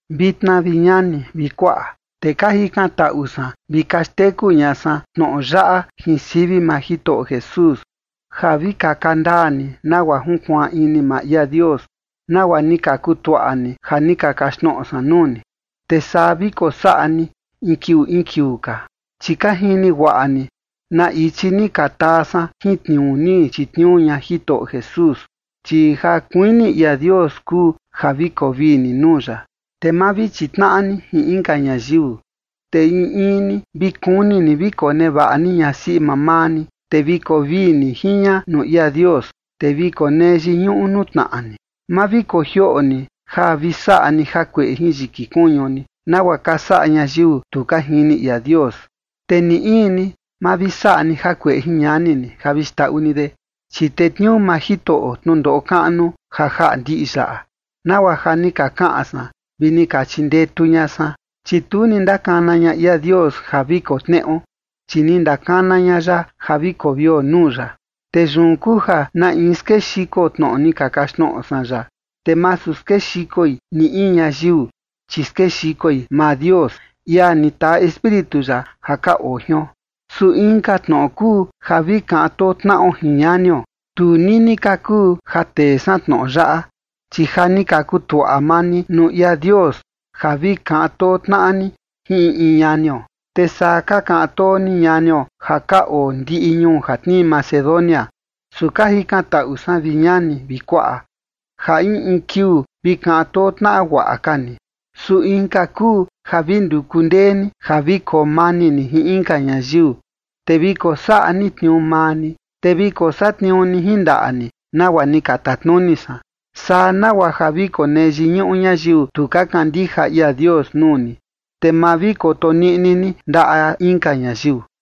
Vitna vi ñani vi kuaꞌa, te ka jikan taꞌu san vi ka xteku ña san tnoꞌo yaꞌa jin sivi maa Jitoꞌo Jesús, ja vi kaka ndaa ni nagua junkuaan ini maa ia Dios, nagua ni ka kutuaꞌa ni ja ni ka kaxtnoꞌo san nuu ni, te saa vi kosaꞌa ni in kiuu in kiuu ka. Chi ka jini guaꞌa ni na ichi ni ka taa san jin tniuu ni chitniuu ña Jitoꞌo Jesús. Chi ja kuini ia Dios kuu ja vi koo vii ni nuu ya, te ma vi chitnaꞌa ni jin inka ñayiu. Te in in ni vi kuni ni vi konevaꞌa ni ñasiꞌi mamaa ni, te vi koo vii ni jin ña nuu ia Dios, te vi konee yiñuꞌu nuu tnaꞌa ni. Ma vi kojioꞌo ni ja vi saꞌa ni jakueꞌe jin yiki kuñu ni, nagua ka saꞌa ñayiu tu ka jini ia Dios. Te ni in ni ma vi saꞌa ni jakueꞌe jin ñani ni ja vi xndaꞌu ni de, chi tetniuu maa Jitoꞌo tnundoꞌo kaꞌnu ja jaꞌa ndiꞌi yaꞌa, nagua ja ni ka kaꞌan san vi ni ka chindetu ña san. Chi tu ni ndakana ña ia Dios ja vi koo tneꞌo, chi ni ndakana ña ya ja vi koo vio nuu ya. Te yun kuu ja na in skexiko tnoꞌo ni ka kaxtnoꞌo san yaꞌa, te masu skexikoi ni in ñayiu, chi skexikoi maa Dios, ia ni taa Espíritu ya ja ka oo jion. Su inka tnoꞌo kuu ja vi kaꞌan too tnaꞌo jin ñanio. Tu nini ka kuu ja tee san tnoꞌo yaꞌa, chi ja ni ka kutuaꞌa maa ni nuu ia Dios ja vi kaꞌan too tnaꞌa ni jin in in ñanio. Te saa ka kaꞌan too ni ñanio ja ka oo ndiꞌi ñuu ja tnii Macedonia. Su ka jikantaꞌu san, vi ñani vi kuaꞌa, ja in in kiuu vi kaꞌan too tnaꞌa guaꞌa ka ni. Su inka kuu ja vi nduku ndee ni ja vi koo mani ni jin inka ñayiu, te vi kosaꞌa ni tniuu maa ni, te vi kosatniuu ni jin ndaꞌa ni nagua ni ka tatnuni san. Saa nagua ja vi konee yiñuꞌu ñayiu tu ka kandija ia Dios nuu ni, te ma vi koto niꞌni ni ndaꞌa inka ñayiu.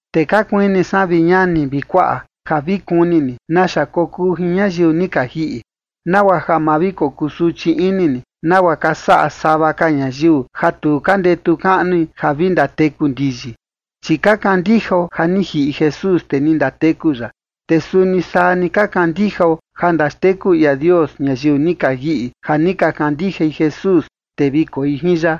Te ka kuini san, vi ñani vi kuaꞌa, ja vi kuni ni naxa kokuu jin ñayiu ni ka jiꞌi, nagua ja ma vi kokusuchi ini ni, nagua ka saꞌa sava ka ñayiu ja tu ka ndetu kaꞌnui ja vi ndateku ndiyi. Chi ka kandijao ja ni jiꞌi Jesús, te ni ndateku ya, te suni saa ni ka kandijao ja ndaxteku ia Dios ñayiu ni ka jiꞌi ja ni ka kandijai Jesús, te vi koi jin ya.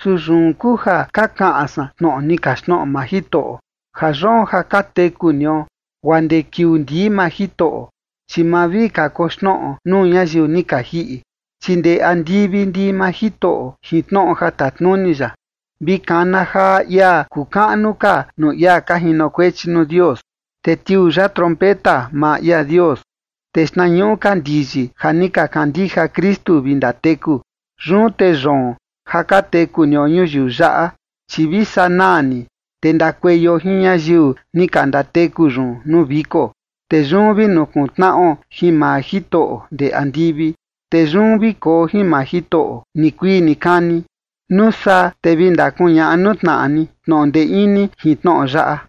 Su yun kuu ja ka kaꞌan san tnoꞌo ni kaxtnoꞌo maa Jitoꞌo, ja yoon ja ka teku nio guaa ndee kiuu ndii maa Jitoꞌo, chi ma vi kakoxnoꞌo nuu ñayiu ni ka jiꞌi, chi ndee andivi ndii maa Jitoꞌo jin tnoꞌo ja tatnuni ya. Vi kana jaa ia kuu kaꞌnu ka nuu ia ka jinokuechi nuu Dios, te tiuu ya trompeta maa ia Dios, te xtnañuꞌu ka ndiyi ja ni ka kandija Kristu vi ndateku. Yun te yoon ja ka teku nio ñuyiu yaꞌa, chi vi sanaa ni, te ndakueio jin ñayiu ni ka ndateku yun nuu viko, te yun vi nukuntnaꞌo jin maa Jitoꞌo ndee andivi. Te yun vi koo jin maa Jitoꞌo nikuii nikani. Nuu saa te vi ndakuñaꞌa nuu tnaꞌa ni tnoꞌo ndee ini jin tnoꞌo yaꞌa.